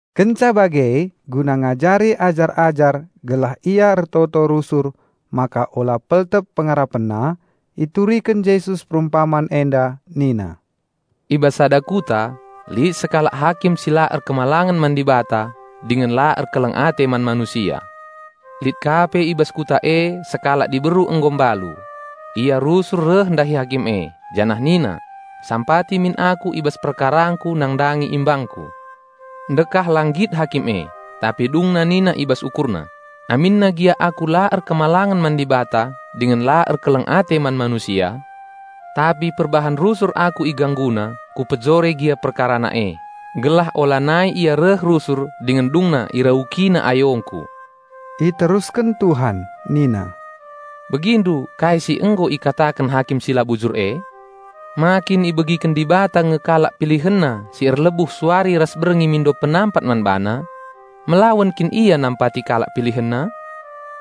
Kenca bage, guna ngajari ajar-ajar gelah ia ertoto rusur maka ola peltep pengarapenna, ituriken Jesus perumpaman enda nina, "I bas sada kuta lit sekalak hakim si la erkemalangen man Dibata dingen la erkeleng ate man manusia. Lit ka pe i bas kuta e sekalak diberu nggo mbalu. Ia rusur reh ndahi hakim e, janah nina, 'Sampati min aku i bas perkarangku nandangi imbangku.' Ndekah la nggit hakim e, tapi dungna nina i bas ukurna, 'Aminna gia aku la erkemalangen man Dibata dingen la erkeleng ate man manusia, tapi perbahan rusur aku igangguna, kupejore gia perkarana e; gelah olanai ia reh rusur dingen dungna iraukina ayongku.'" Iterusken Tuhan nina, "Begindu kai si nggo ikataken hakim si la bujur e? Ma kin ibegiken Dibata nge kalak PilihenNa si erlebuh suari ras berngi mindo penampat man BaNa? Melawen kin Ia nampati kalak PilihenNa?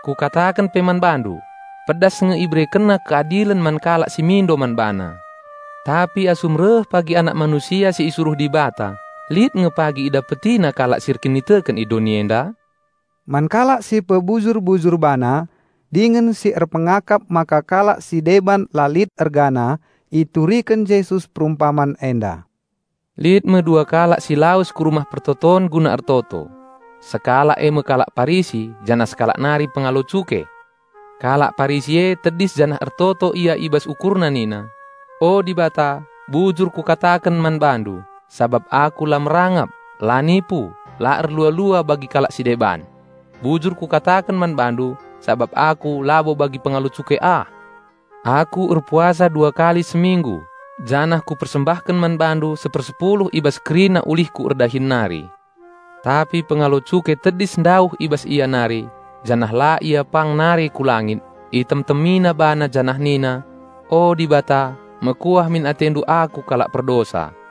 Kukataken pe man bandu, pedas nge IberekenNa keadilen man kalak si mindo man BaNa. Tapi asum reh pagi Anak Manusia si isuruh Dibata lit nge pagi IdapetiNa kalak si erkiniteken i doni enda?" Man kalak si pebujur-bujur bana dingen si erpengakap maka kalak si deban la lit ergana, ituriken Jesus perumpaman enda, "Lit me dua kalak si lawes ku Rumah Pertoton guna ertoto. Sekalak e me kalak Parisi janah sekalak nari pengalo cuke. Kalak Parisi e tedis janah ertoto ia i bas ukurna nina, 'O Dibata, bujur kukataken man BaNdu, sabap aku la merangap, la nipu, la erlua-lua bagi kalak si deban. Bujur kukataken man BaNdu sabap aku labo bagi pengalo cuke ah. Aku erpuasa dua kali seminggu, janah kupersembahken man BaNdu sepersepuluh i bas kerina ulihku erdahin nari.' Tapi pengalo cuke tedis ndauh i bas ia nari, janah la ia pang nare ku langit, itemtemina bana janah nina, 'O Dibata, mekuah min atendu aku kalak perdosa!'"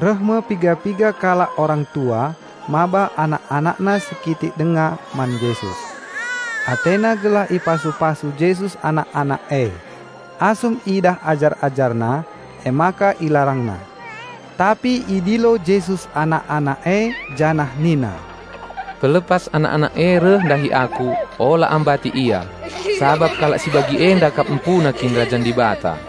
Reh me piga-piga kalak orang tua maba anak-anakna si kitik denga man Jesus. Atena gelah ipasu-pasu Jesus anak-anak e. Asum idah ajar-AjarNa, emaka ilarangna. Tapi idilo Jesus anak-anak e janah nina, "Pelepas anak-anak e reh ndahi Aku, ola ambati ia. Sabap kalak si bagi enda kap empuna Kinirajan Dibata.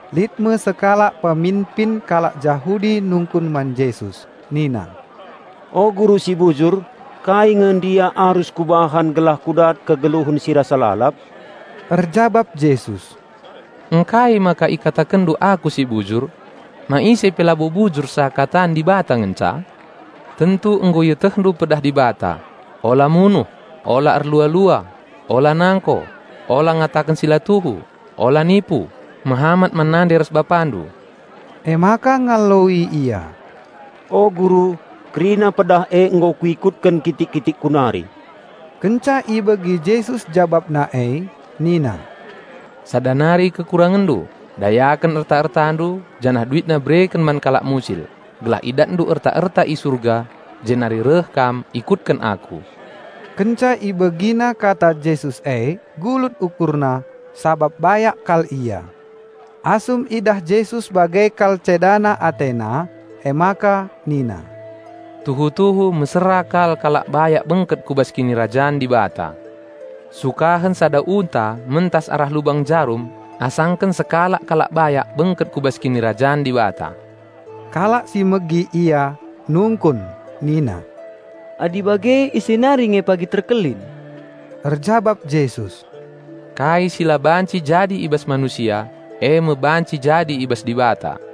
Lit me sekalak peminpin kalak Jahudi nungkun man Jesus nina, "O Guru si bujur, kai nge ndia arus kubahan gelah kudat kegeluhen si rasa lalap?" Erjabap Jesus, "Ngkai maka ikatakenndu Aku si bujur? Ma ise pe labo bujur seakatan Dibata ngenca? Tentu nggo ietehndu pedah Dibata, 'Ola munuh; ola erlua-lua; ola nangko; ola ngataken si la tuhu; ola nipu; mehamat man nande ras bapandu.'" Emaka ngaloi ia, "O Guru, kerina pedah e nggo kuikutken kitik-kitikku nari." Kenca ibegi Jesus jabapna e nina, "Sada nari kekurangenndu, dayaken erta-ertandu janah duitna bereken man kalak musil, gelah idatndu erta-erta i Surga; jenari reh kam, ikutken Aku." Kenca ibegina kata Jesus e gulut ukurna, sabap bayak kal ia. Asum idah Jesus bage kal cedana atena, emaka nina, "Tuhu-tuhu mesera kal kalak bayak bengket ku bas Kinirajan Dibata. Sukahen sada unta mentas arah lubang jarum asangken sekalak kalak bayak bengket ku bas Kinirajan Dibata." Kalak si megi Ia nungkun nina, "Adi bage ise nari nge pagi terkelin?" Erjabap Jesus, "Kai si la banci jadi i bas manusia, e me banci jadi i bas Dibata."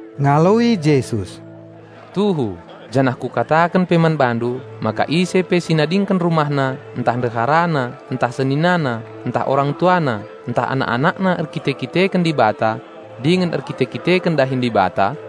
Ngaloi Jesus, "Tuhu, janah Kukataken pe man bandu maka ise pe si nadingken rumahna ntah ndeharana ntah seninana ntah orang tuana ntah anak-anakna erkite-kiteken Dibata dingen erkite-kiteken dahin Dibata,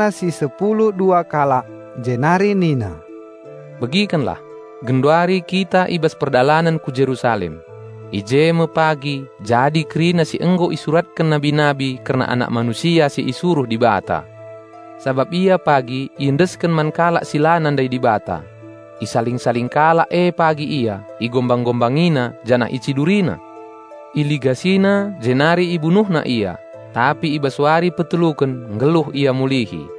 Idilo Jesus ajar-AjarNa si sepulu dua kalak, jenari nina, "Begikenlah! Genduari kita i bas perdalanen ku Jerusalem. I je me pagi jadi kerina si nggo isuratken nabi-nabi kerna Anak Manusia si isuruh Dibata. Sabap Ia pagi iendesken man kalak si la nandai Dibata. Isaling-saling kalak e pagi Ia, igombang-gombangina janah icidurina. Iligasina jenari ibunuhna Ia, tapi i bas wari peteluken nggeluh Ia mulihi."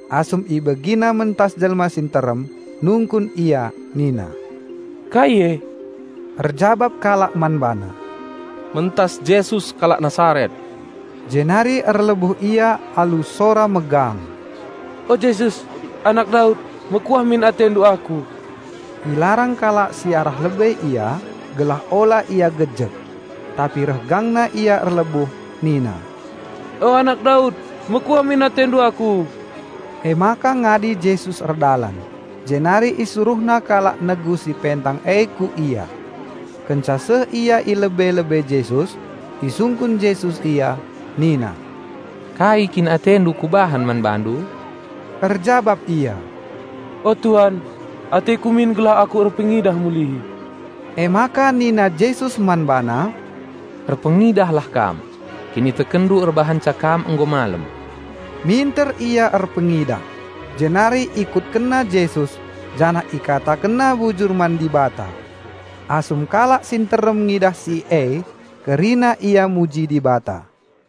Asum ibegina mentas jelma si nterem, nungkun ia nina, "Kai e?" Erjabap kalak man bana, "Mentas Jesus kalak Nasaret." Jenari erlebuh ia alu sora megang, "O Jesus! Anak Daud! Mekuah min AteNdu aku." Ilarang kalak si arah lebe ia, gelah ola ia gejek. Tapi reh gangna ia erlebuh nina, "O Anak Daud! Mekuah min AteNdu aku." Emaka ngadi Jesus erdalan, jenari IsuruhNa kalak negu si pentang e ku Ia. Kenca seh ia i lebe-lebe Jesus, isungkun Jesus ia nina, "Kai kin atendu Kubahan man bandu?" Erjabap ia, "O Tuan, ateku min gelah aku erpengidah mulihi." Emaka nina Jesus man bana, "Erpengidahlah kam! Kinitekenndu erbahanca kam nggo malem." Minter ia erpengidah, jenari ikutkenna Jesus, janah ikatakenna bujur man Dibata. Asum kalak si nterem ngidah si e, kerina ia muji Dibata.